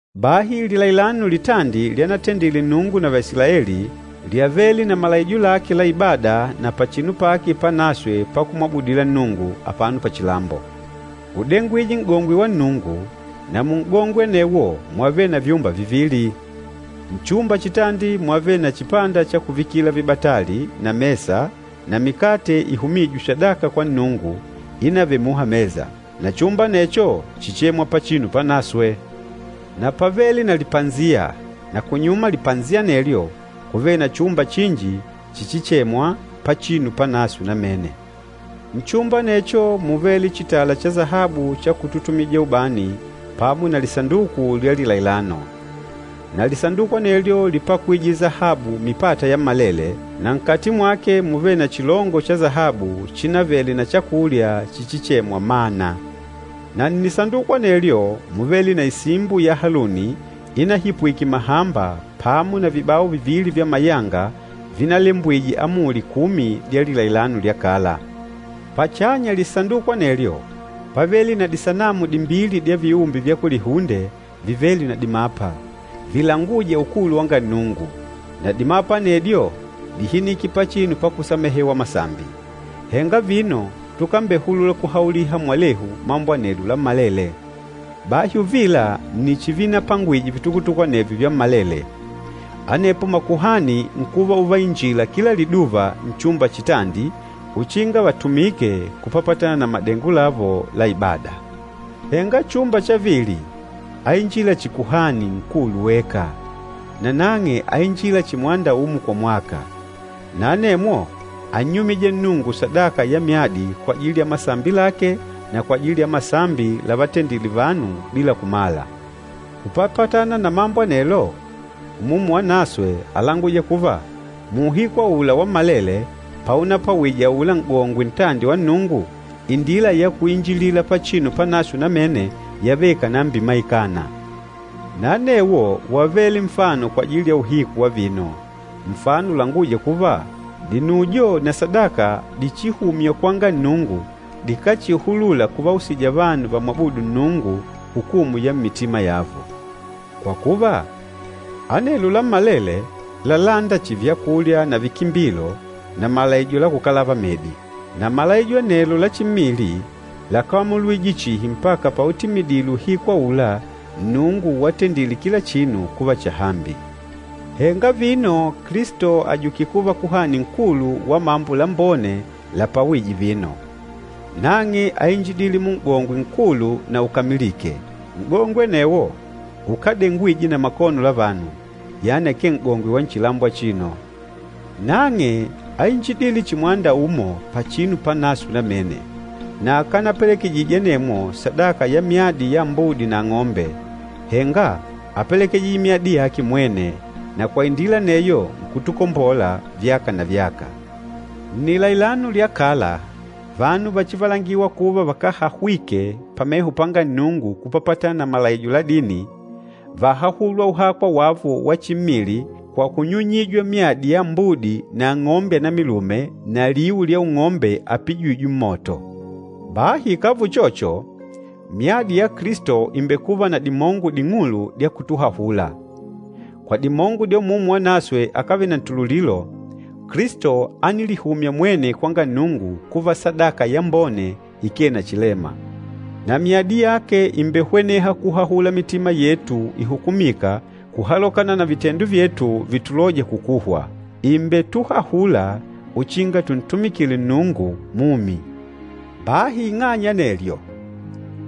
Bahi lilailano litandi lyanatendile Nnungu na Vaisilaeli lyávele na malaijo lake la ibada na pachinu pake panaswe pakumwabudila Nnungu, apano pachilambo. Údengwije N'gongwe wa Nnungu, na mun'gongwe anewo wávele na vyumba vivili. Nchumba chitandi mwávele na chipanda cha kuvikila vibatali na mesa na mikate ihumîjwe sadaka kwa Nnungu ínavele muha mesa. Na chumba anecho chíchemwa, Pachinu Panaswe. Na pávele na lipasiya, na kunyuma lipasiya anelyo kúvele na chumba chinji chichichemwa, Pachinu Panaswe Namene. Nchumba anecho múvele chitala cha sahabu cha kututumija ubani pamo na lisanduku lya lilailano. Na Lisanduku anelyo lípakwije sahabu mipata yammalele, na nkati mwake múvele na chilongo cha sahabu chínavele na chakulya chichichemwa “Mana.” Na nnisanduku anelyo múvele na isimbo ya Haluni inahipwike mahamba pamo na vibao vivili vya mayanga vinalembwije Amuli Kumi dya lilailano lya kala. Pachanya lisanduku anelyo pávele na disanamu dimbili dya viumbe vya kulihunde vivêle na dimapa, vilangûja ukulu wanga Nnungu, na dimapa anedyo díhinike pachinu pakusamehewa masambi. Henga vino tukambehulula kuhauliha mwalehu mambo anelo lammalele. Bahi uvila nni chivinapangwije vitukutuku anevyo vyammalele. Anepo makuhani nkuva uvainjila kila liduva nchumba chitandi uchinga vatumike kupapatana na madengo lavo la ibada. Henga chumba cha vili áinjila chihi Kuhani Nkulu weka, nanang'e áinjila chihi mwanda umo kwa mwaka. Na anemwo ánnyumija Nnungu sadaka ya myadi kwajili ya masambi lake na kwajili ya masambi lavatendile vanu bila kumala. Kupapatana na mambo anelo, Umumu Wanaswe álanguja kuva, muuhiku aula wammalele paunapwawije aula N'gongwe ntandi wa Nnungu, indila ya kuinjilila Pachinu Panaswe Namene yávele ikànambimaikana. Na anewo wávele nfano kwajili ya uhiku wa vino, nfano ulangûja kuva dinujo na sadaka dichihumywa kwanga Nnungu dikáchihulula kuvausija vanu vamwabûdu Nnungu hukumu ya mmitima yavo. Kwa kuva, anelo lammalele lálanda chihi vyakulya na vikimbilo na malaijo la kukalava medi. Na malaijo anelo la chimmili lákamulwije chihi mpaka pautimidile uhiku aula Nnungu watendile kila chinu kuva chahambi. Henga vino Kilisto àjukile kuva Kuhani Nkulu wa mambo lambone lapwawîje vino. Nang'e áinjidile Mun'gongwe nkulu na ukamilîke. N'gongwe anewo ukádengwije na makono la vanu, yani akee N'gongwe wa nchilambo achino. Nang'e áinjidile chihi mwanda umo Pachinu Panaswe Namene. Na akanapelekejije anemwo sadaka ya myadi ya ambudi na ang'ombe, henga ápelekejije myadi yake mwene, na kwa indila aneyo nkutukombola vyaka na vyaka. Nnilailano lya kala vanu váchivalangiwa kuva vakáhahwike pameho panga Nnungu kupapatana na malaijo la dini, váhahulwa uhakwa wavo wa chimmili kwa kunyunyijwa myadi ya ambudi na ang'ombe anamilume na liu lya ung'ombe apijîjwe mmoto. Bahi ikàva uchocho, myadi ya Kilisto ìmbekuva na dimongo ding'ulu dya kutuhahula! Kwa dimongo dya Umumu Wanaswe akávele na ntululilo, Kilisto ánilihumya mwene kwanga Nnungu kuva sadaka yambone ikee na chilema. Na myadi yake ìmbehweneha kuhahula mitima yetu ihukumîka kuhalokana na vitendo vyetu vítulòjà kukuhwa. Ìmbetuhahula uchinga tuntumikile Nnungu Mumi. Bahi ing'anya ya anelyo,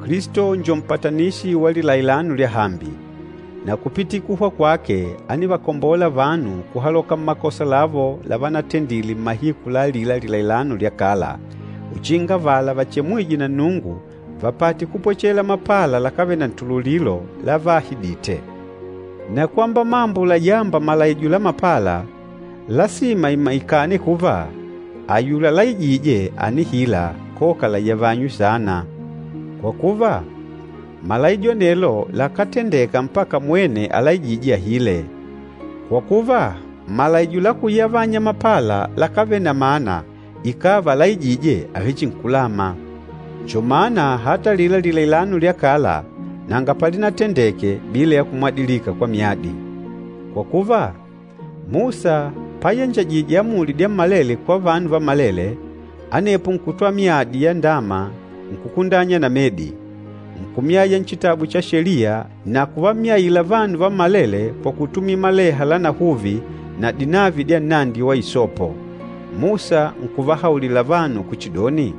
Kilisto njo mpatanishi wa lilailano lyahambi. Na kupitila kuhwa kwake ánivakombola vanu kuhaloka mmakosa lavo lavanatendile mmahiku la alila lilailano lya kala, uchinga avala vachemwîje na Nnungu vapate kupwechela mapala lakávele na ntululilo lavaahidite. Na kwamba mambo layâmba malaijo la mapala, lasima imaikane kuva ayula alaijîje ànihila koka layavanywe saana. Kwa kuva, malaijo anelo lakátendeka mpaka mwene alaijîje ahile, kwa kuva malaijo la kuyavanya mapala lakávele na mana ikàva alaijîje àvechinkulama. Njo mana ata alila lilailano lya kala nanga palinatendeke bila ya kumwadilika kwa myadi. Kwa kuva, Musa payanjajije amuli dyammalele kwa vanu vammalele, anepo nkutwala myadi ya ndama nkukundanya na medi, nkumyaya nchitabu cha Sheliya na kuvamyaila vanu vammalele kwa kutumila maleha lanahuvi na dinavi dya nnandi wa isopo. Musa nkuvahaulila vanu kuchidoni,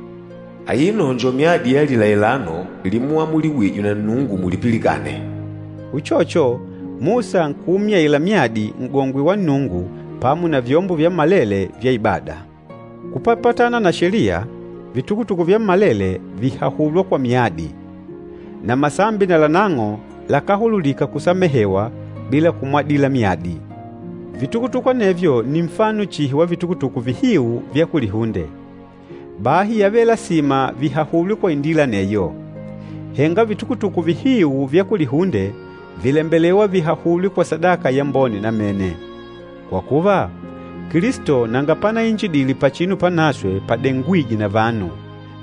“Aino njo myadi ya lilailano limuamuliwije na Nnungu mulipilikane.” Uchocho, Musa nkuumyaila myadi N'gongwe wa Nnungu pamo na vyombo vyammalele vya ibada. Kupapatana na Sheliya, vitukutuku vyammalele vìhahulwa kwa myadi, na masambi nalanang'o lakáhululika kusamehewa bila kumwadila myadi. Vitukutuku anevyo nni nfano chihi wa vitukutuku vihiu vya kulihunde, bahi yávele lasima vihahulwe kwa indila aneyo. Henga vitukutuku vihiu vya kulihunde vìlembelewa vihahulwe kwa sadaka yambone namene. Kwa kuva, Kilisto nanga panainjidile Pachinu Panaswe padengwîjwe na vanu,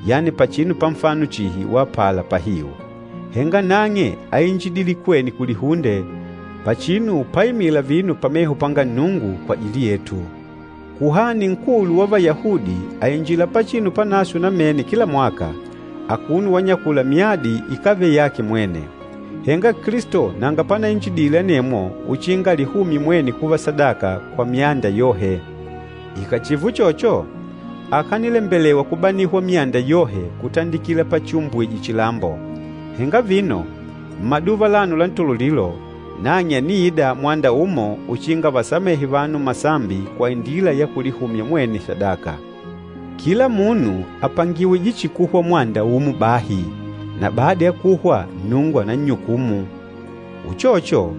yani pachinu pa nfano chihi wa apala pahiu. Henga nang'e áinjidile kwene kulihunde, pachinu páimìlà vino pameho panga Nnungu kwajili yetu. Kuhani Nkulu wa Vayahudi àinjila Pachinu Panaswe Namene kila mwaka, akuno wanyakula myadi ikávele yake mwene. Henga Kilisto nanga panainjidile anemwo uchinga alihumye mwene kuva sadaka kwa myanda yohe. Ikàchiva uchocho, akanilembelewa kubanihwa myanda yohe kutandikila pachiumbwije chilambo. Henga vino, mmaduva alano la ntululilo, nang'e àniida mwanda umo uchinga avasamehe vanu masambi kwa indila ya kulihumya mwene sadaka. Kila munu àpangiwije chihi kuhwa mwanda umo bahi, na bada ya kuhwa Nnungu ànannyukumu. Uchocho,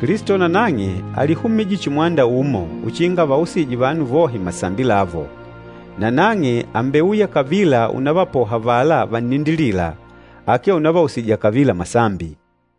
Kilisto nanang'e álihumije chihi mwanda umo uchinga avausije vanu vohe masambi lavo. Na nang'e àmbeuya kavila unavapoha avala vannindilîla, akee unavausija kavila masambi.